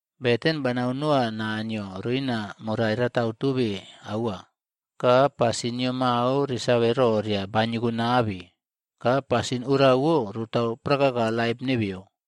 Beten banau noa Naniyo roina morai ratau tobe aua ka o rarai rakotobe ka pasin nio mau resave roria baniyokonabe. Ka pasin orawo rotau prakaka laip nebeyo.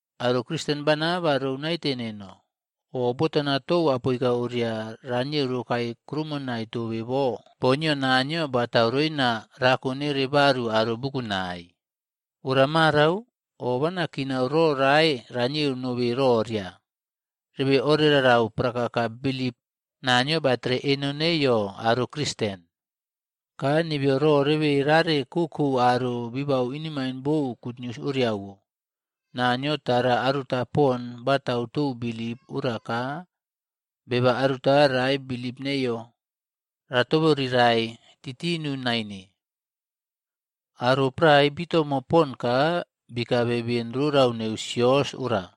Aro Kristen bana ba rou naite nino, o botana tou apoika oria ranieu rokae kuroumonai tobe bo boo nio Naniyo batau roina rako neiyo baru aro bukunai. Ora marau, o banakinau ro rae ranieu nobe roria, rebe orerarau prakaka bilip Naniyo batere eno neiyo aro Kristen. Ka nebeyo ro rebe rare kokou aro bibabau inemaine bou gutnius oriawo. Naniyo tara aruta pon batau tou bilip ora ka beba aruta rae bilip neiyo ratoborirae titinu naine. Aro prae bitomo pon ka bikabe beni rorau neu sios ora.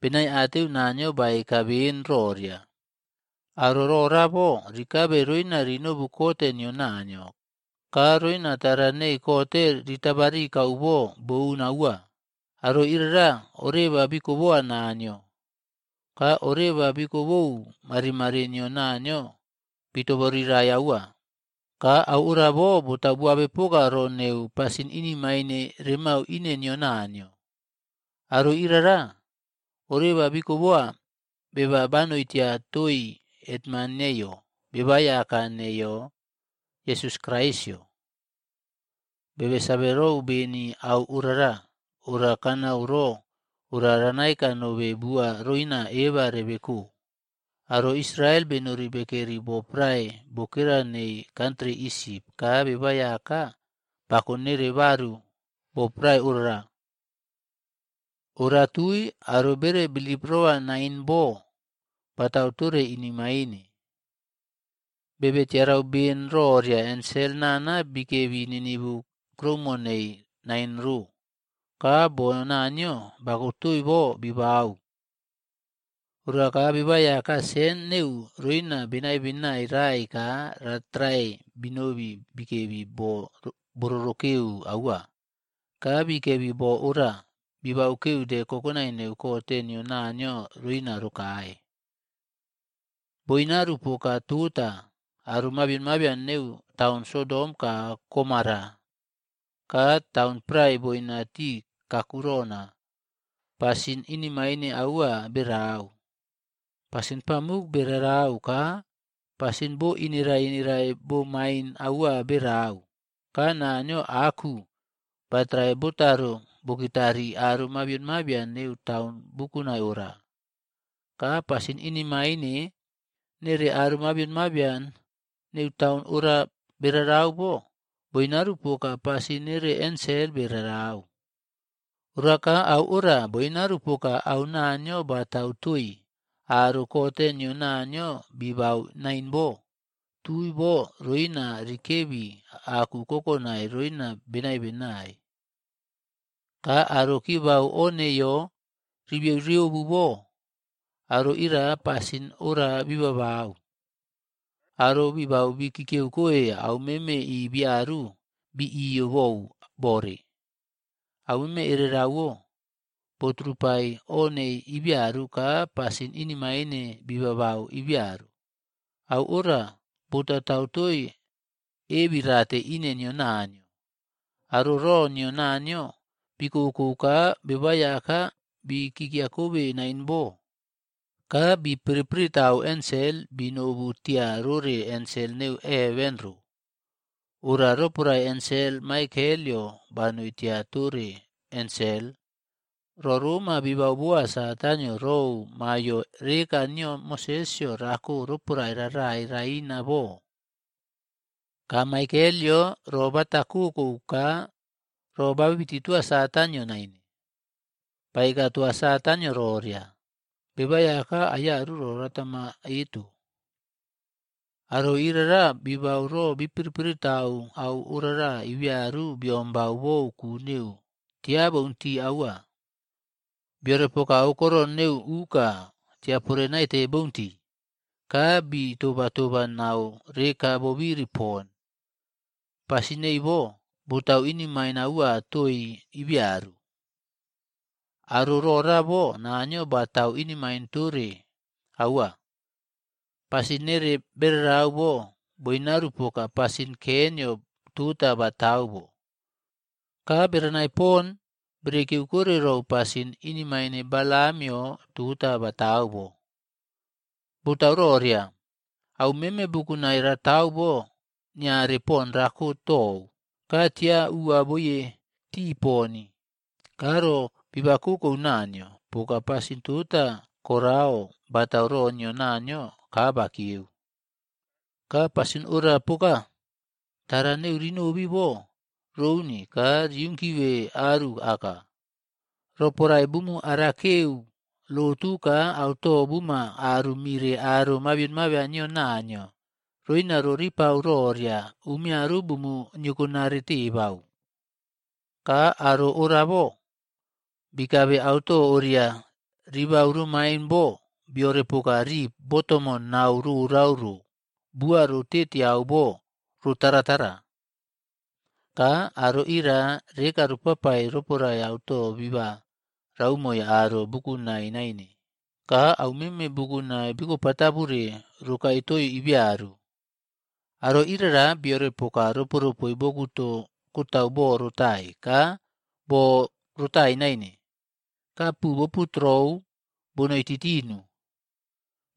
Benaiateu Naniyo baeka beni roria, aro rorabo rikabe roina rinobu kote nio Naniyo, ka roina tara nei kot ritabarikau bo boun aua. Aro ira oreba bikoboa Naniyo, ka oreba bikobou marimari nio Naniyo bitoborirai aua, ka au orabo botau boabepoka ro neu pasin inemain remau ine nio Naniyo. Aro irara, oreba bikoboa beba banoi tia toi hetman neiyo, BebaꞌAiyaka neiyo Yesus Kraisꞌyo. Bebe save rou beni au orara. Ora kanau ro ora ranaeka nobe bua roina eba rebeko. Aro Israel benori bekeri bo prae bokera neu kantri Isip ka BebaꞌAiyaka bakonere baru bo prae orara. Ora tui, aro bere bilip roa nain boa batau tore inemain. Bebe tiarau ben roria ensel nana bikebi ninivu kuroumo nei nain rob ka boo Naniyo bakotoi bo bibau, oraka BebaꞌAiyaka sen neu roina benai benai raꞌaii ka batrae binobi bikebi bo bororokeu aua. Ka bikebi bo ora bibaukeu de kokonai neu kote nio Naniyo roina rokae. Boinaru poka tota, aro mabian mabion neu taun Sodom ka Gomora ka taun prae boina tii kakurona, pasin inemain aua berau. Pasin pamuk bere rau ka pasin bo inerae inerae bomain aua berau. Ka Naniyo aku batrae botaro bokitarii aro mabian mabion neu taun bukunai ora. Ka pasin inemaine nere aro mabian mabion neu taun ora berarau bo, boinaru poka pasin nere ensel berarau. Ora ka au ora boinaru poka au Naniyo batau toi aro kote nio Naniyo bitabau nain bo, tui bo roina rikebi aku kokonai roina benai benai. Ka aro kibau o nebeyo ribiyeuꞌriobu bo, aro ira pasin orara bibabau. Aro bibau bi kikiyeukoe aumeme ibiyaru bi iyo bou bore, aumeme erereꞌwo boturupai o nei ibiyaru ka pasin inemain bibabau ibiyaru, au ora botatau toi ebirate ine nio Naniyo. Aro ro nio Naniyo bikokou ka BebaꞌAiyaka bikikiyakobe nain bo ka bi piripiritau ensel binobu tia rore ensel neu heven ro. Ora roporae ensel Maikelꞌyo banoi tia tore ensel, ro roma bibau boa Satanꞌyo rou maiyo reka nio Mosesꞌyo rako roporae rarai raina bo. Ka Maikelꞌyo ro bata kokou ka ro babiti toa Satanꞌyo nine. Baeka toa Satanꞌyo roria, “BebaꞌAiyaka aiyaru ro ratama eto.” Aro irara bibau ro bi piripiri tau au ora ibiyaru biombau bou ku neu tiaboun tii aua. Biorepoka aukoron neu uka tiapore naite bountii ka bi tobaꞌtoba nau reka bobiri pon. Pasin nei bo, botau inemain aua toi ibiyaru. Aro rora bo Naniyo ratau inemain tore aua. Pasin nere berau bo boinaru poka pasin Keinꞌyo tota batau bo.c Ka berenai pon bere kiyeukore rou pasin inemain Balamꞌyod tota batau bo, botauroria au meme bukunai ratau bo niare poni rako tou. Ka tia uwaboiye tii poni ka ro bibakokou Naniyo, poka pasin tota Koraꞌo batau ro nio Naniyo kabakiyeue. Ka pasin ora poka, tara neu rinobi bo rouni ka riunkive aru aka. Roporae bumu arakeu lotu ka auto buma aru mire aro mabion mabian nio Naniyo roina roripau roria umiyaru bumu niyokonare tebau. Ka aro rorabo bikabe auto oria ribau romain bo biorepoka rip botomo nau rorau ro bua rotetiau bo rotaratara.f Ka aro ira reka bopapai roporae auto biba raumoii aro bukunai naine ka au meme bukunai bikopatabure rokae toi ibiyaru. Aro irara biorepoka roporopoe bokuto kotau bo rotai ka borotai naine ka pu boputurou bonoi titinu.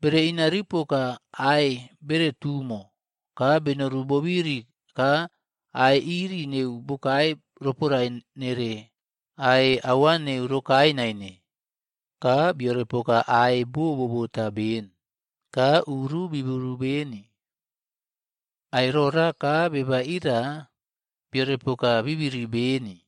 Bere inariu poka ae bere tumo ka benoru bobiri ka ae iri neu bokae roporae nere ae aua neu rokae nain. Ka biorepoka ae bo bobota ben ka uru biburu beni. Ae rora ka beba ira biore poka, bi biri aka beni.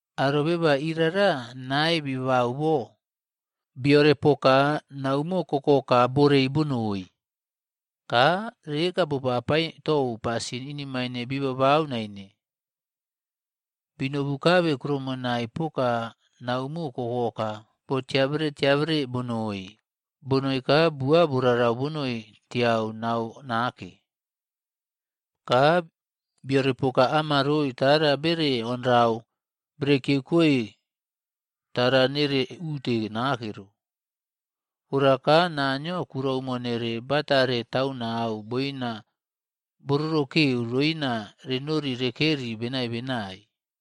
Aro beba irara nae bibabau bo. Biorepoka naumo kokoka borei bonoi. Ka reka bopapai tou pasin inemain bibabau naine. Binobukabe kuroumonai poka naumo kokoka botiabere tiabere bonoi ka bua borarau boina tiau nau nake. Ka biorepoka amaroe tara bere onrau berekiyeu koe tara nere ute nake. Ora ka Naniyo kuroumo nere batare taunau boina bororokeu roina renori rekeri benai benai.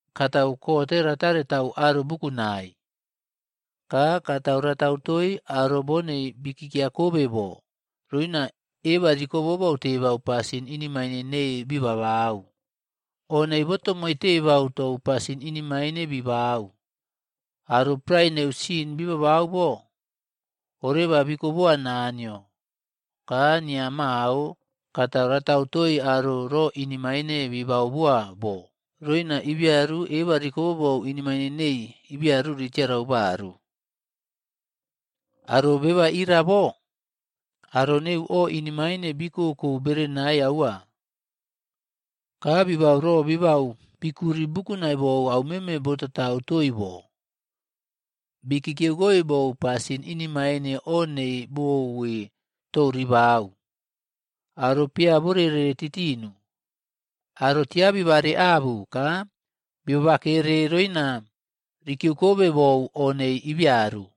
Katau kote ratare tau aro bukunai. Ka katau ratau toi aro bonei bikikiyakobe bo, roina ebarikobobou tebau pasin inemaine nei bibabau. O nei botomoi tebau tou pasin inemain bibau. Aro prae neu sin bibabau bo, oreba bikoboa Naniyo. Ka niya mao, katau ratau toi aro ro inemaine bibau boa bo roina ibiyaru ebarikobobou inemain nei ibiyaru ritiarau barug.” Aro beba ira bo, aro neu o inemain bikoko berenai aua, ka bibau ro bibau bikuri bukunai bou aumeme botatau toi bo. Bikikiyeu koe bou pasin inemaine o nei bouwe tou ribau. Aro peyaborerei titinu. Aro tia bibareabu ka bibabakere roina rikiyeukobe bou o nei ibiyaru.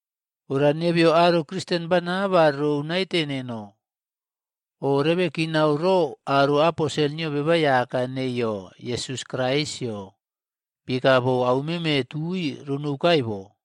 Ora nebeyo aro Kristen bana ba rou naite neno, o rebe kinau ro aro aposel nio BebaꞌAiyaka neiyo Yesus Kraisꞌyo bieka bou aumeme tui ronoukae bo.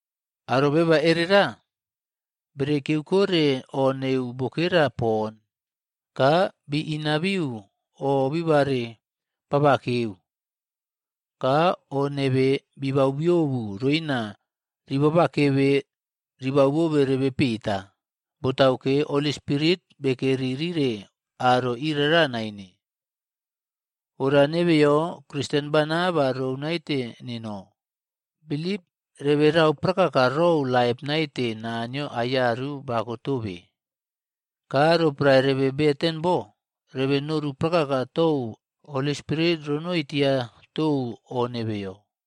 Aro beba erera, bere kikieukore o neu bokera pon ka biꞌinabiu o bibare babakeu ka o nebe bibaubiobu roina ribabakebe ribaubobe rebe peta. Botauke, Holi Spirit bekeri rire aro irara nain. Ora nebeyo Kristen bana ba rou naite nino bilip reberau prakaka rou laip naite Naniyo aiyaru bakotobe. Ka roporae rebe beten bo, rebe noru prakaka tou Holi Spirit ronoi tia tou o nebeyo.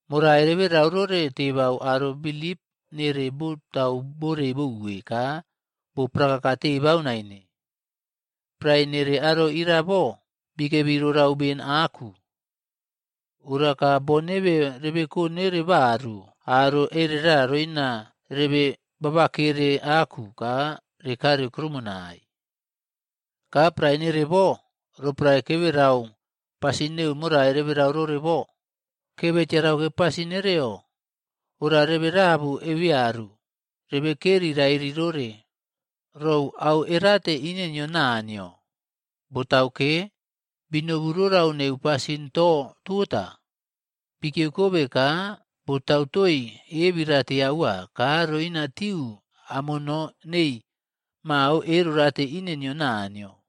Morai reberau rore tebau aro bilip nere botau borei bouwe ka bo prakaka tebau nain bo. Prae nei aro ira bo, bikebi rorau beni aku. Ora ka boo nebe rebeko nere baru aro erera roina rebe babakere aku ro rekare kuroumonai. Ka prae nere bo, roporae keberau pasin neu morai reberau rore bo, kebe tiarauke pasin nere ora rebe rabu ebeyaru rebe rebekeri rairi rore rou au erate ine nio Naniyo. Botauke, binobi rorau neu pasin to tota bikiyeukobe ka botau toi ebirate aua ka roinatiu amono nei mau erorate ine nio Naniyo.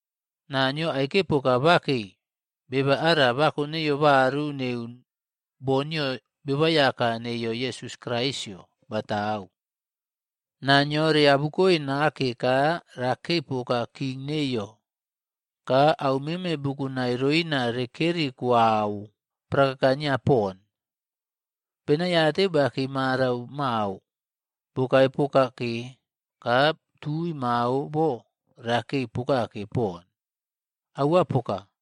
Naniyo aike poka bakei beba ara bako neiyo baru neu boo nio BebaꞌAiyaka neiyo Yesus Kraisꞌyo batau. Naa nio reabukoe nake ka rakei poka king neiyo ka au meme bukunai roina rekeri kuau prakaka nio pon. Benaiateu bakei marau mao bakei pokake ka tui mao bo rakei pokake poni. Aua poka.